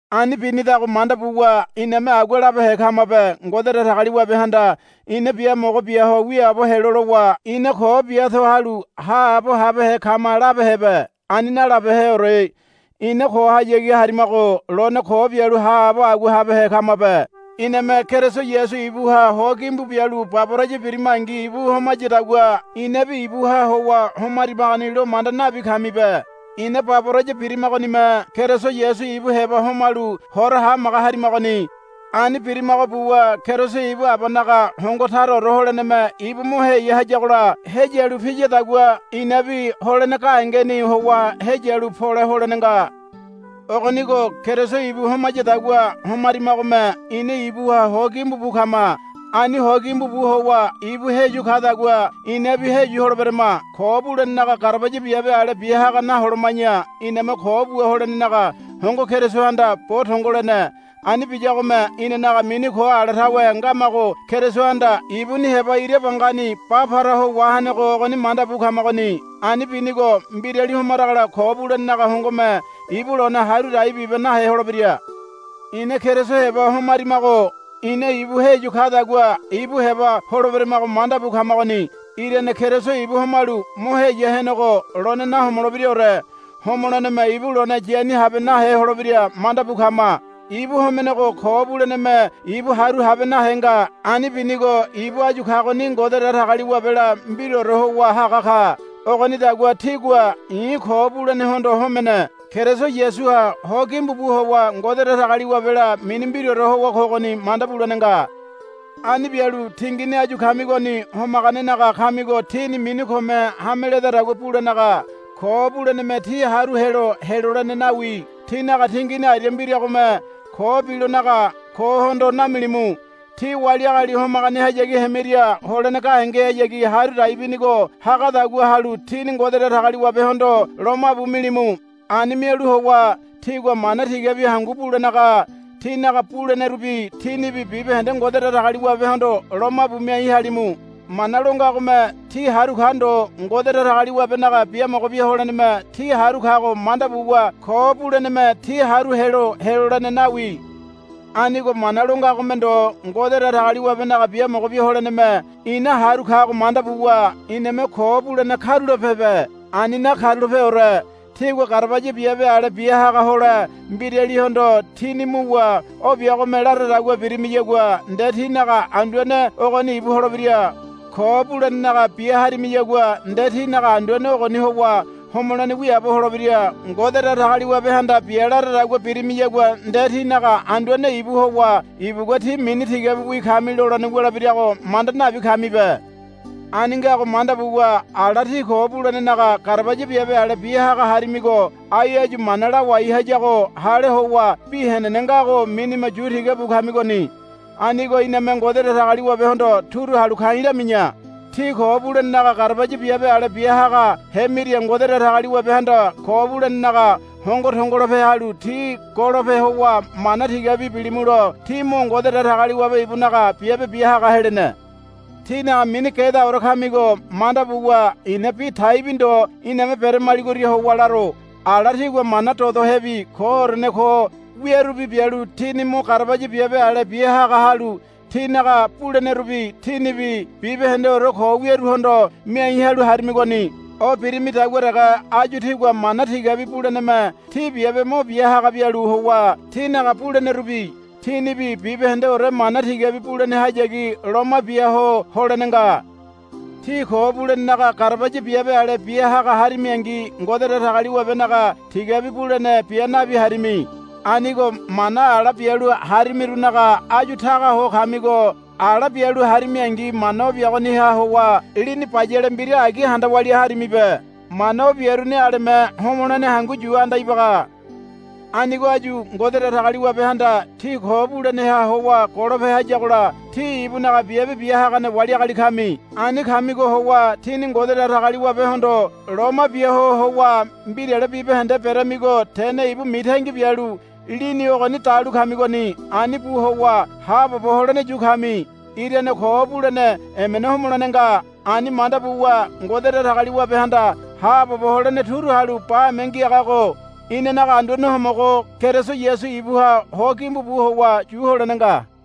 Ani binidago manda buwa iname agua labehe kamabe. Ngode Datagaliwabehanda ina biamogo bia ho wiaabo helo lowa ina ko bia to halu haabo habehe kama labehebe. Ani nalabeheore. Ina kohayagi homarimago lone ko bialu haabo agua habehe kamabe. Iname Keriso Yasu ibuha ho gimbu bialu baboraya birimangi ibu homayadagua inabi ibuha howa homarimagoni lo manda nabi kamibe. Ina baboraya birimagonime Keriso Yasu ibu heba homalu hora hamaga harimagoni. Ani birimago buwa Keriso ibu Abanaga hongo taraore holeneme ibu mo heya hayagola heyalu piyadagua inabi holene gahengeni howa heyalu pole holene nga. Ogonigo Keriso ibu homayadagua homarimagome ina ibuha ho gimbu bu kama. Ani ho gimbu bu howa ibu heyu kadagua inabi heyu holeberama. Ko bulenenaga garabaya biabe ale biahaga naholoma̱ya iname ko bua holenenaga hongo Kerisohanda bo tongo lene. Ani biyagome inanaga mini ko ala tawe ngamago Kerisohanda ibuni heba ira bangani ba para ho wahenego ogoni manda bu kamagoni. Ani binigo mbirali homaragola ko bulenenaga hongome ibu lone haru dai bibe nahe holebira. Ina Keriso heba homarimago ina ibu heyu kadagua ibu heba holeberamago manda bu kamagoni. Irane Keriso ibu homalu mo heya henego lone nahomolebiraore. Homoleneme ibu lone yani habe nahe holebira manda bu kama. Ibu homenego ko buleneme ibu haru habe nahe nga. Ani binigo ibu áyu kagoni Ngode Datagaliwabela mbiraore howa haga ka. Ogonidagua tígua, I̱ ko bulenehondo homene. Keriso Yasuha ho gimbu bu howa Ngode Datagaliwabela mini mbiraore howa kogoni, manda bulene nga. Ani bialu tingini áyu kamigoni homaganenaga kamigo tíni mini kome hame ledadagua bulenaga ko buleneme tí haru helo helolene nawi. tínaga tingini aria mbiragome ko bilonaga kohondo namilimu. Tí wali agali homaganehayagi hemiria holene gahengehayagi haru dai binigo hagadagua halu tíni Ngode Datagaliwabehondo lomabu milimu. Ani mialu howa tígua mana tigabi hangu bulenaga tínaga bulenerubi tínibi bibahende Ngode Datagaliwabehondo lomabu miai halimu. Mana lo ngagome tí haru ka ndo. Ngode Datagaliwabenaga biamogo bia holeneme tí haru kago manda buwa ko buleneme tí haru helo helolene nawi. Anigo mana lo ngagome ndo Ngode Datagaliwabenaga biamogo bia holeneme ina haru kago manda buwa iname ko bulene karulapebe. Ani nakarulapeore. Tígua garabaya biabe ale bia haga hole mbiralihondo tíni muwa o biagome laradagua birimiyagua nde tínaga anduane ogoni ibu holebira. Ko bulenenaga bia harimiyagua nde tínaga anduane ogoni howa homolene wiaabo holebira. Ngode Datagaliwabehanda bia laradagua birimiyagua nde tínaga anduane ibu howa ibugua, Tí mini tigabiwi kami, lolene wulebirago manda nabi kamibe. Ani ngago manda buwa ala tí ko bulenenaga garabaya biabe ale bia haga harimigo ai áyu mana lawai hayago hale howa bi henene ngago minime yu tiga bu kamigoni. Anigo iname Ngode Datagaliwabehondo turu halu ka̱i̱ lami̱ya. Tí ko bulenenaga garabaya biabe ale bia haga hemiria Ngode Datagaliwabehanda ko bulenenaga hongo tongolope halu tí golope howa mana tigabi bilimulo tí mo Ngode Datagaliwabe ibunaga biabe bia haga helene. tínaga mini gedaore kamigo manda buwa i̱na bi taibi ndo iname beramaligoria howa laro. Ala tígua mana dodohebi koorene ko wiarubi bialu tíni mo garabaya biabe ale bia haga halu tínaga bulenerubi tínibi bibahendeore ko wiaruhondo miai halu harimigoni. O birimidagua dege áyu tígua mana tigabi buleneme tí biabe mo bia haga bialu howa tínaga bulenerubi tínibi bibahendeore mana tigabi bulenehayagi loma bia ho holene nga. Tí ko bulenenaga garabaya biabe ale bia haga harimiangi Ngode Datagaliwabenaga tigabi bulene bia nabi harimi. Anigo mana ala bialu harimirunaga áyu taga ho kamigo ala bialu harimiangi mana o biagoniha howa lini bayale mbira agi handa walia harimibe. Mana o biaruni aleme homolene hangu yu anda ibaga. Anigo áyu Ngode Datagaliwabehanda tí ko buleneha howa golope hayagola tí ibunaga biabe bia hagane wali agali kami. Ani kamigo howa tíni Ngode Datagaliwabehondo loma bia ho howa mbirale bibahende beramigo tene ibu mitangi bialu lini ogoni dalu kamigoni. Ani bu howa haabobo holene yu kami. Irane ko bulene emena homolene nga. Ani manda buwa Ngode Datagaliwabehanda haabobo holene turu halu bame ngiagago inanaga Anduane Homogo Keriso Yasu ibuha ho gimbu bu howa yu holene nga.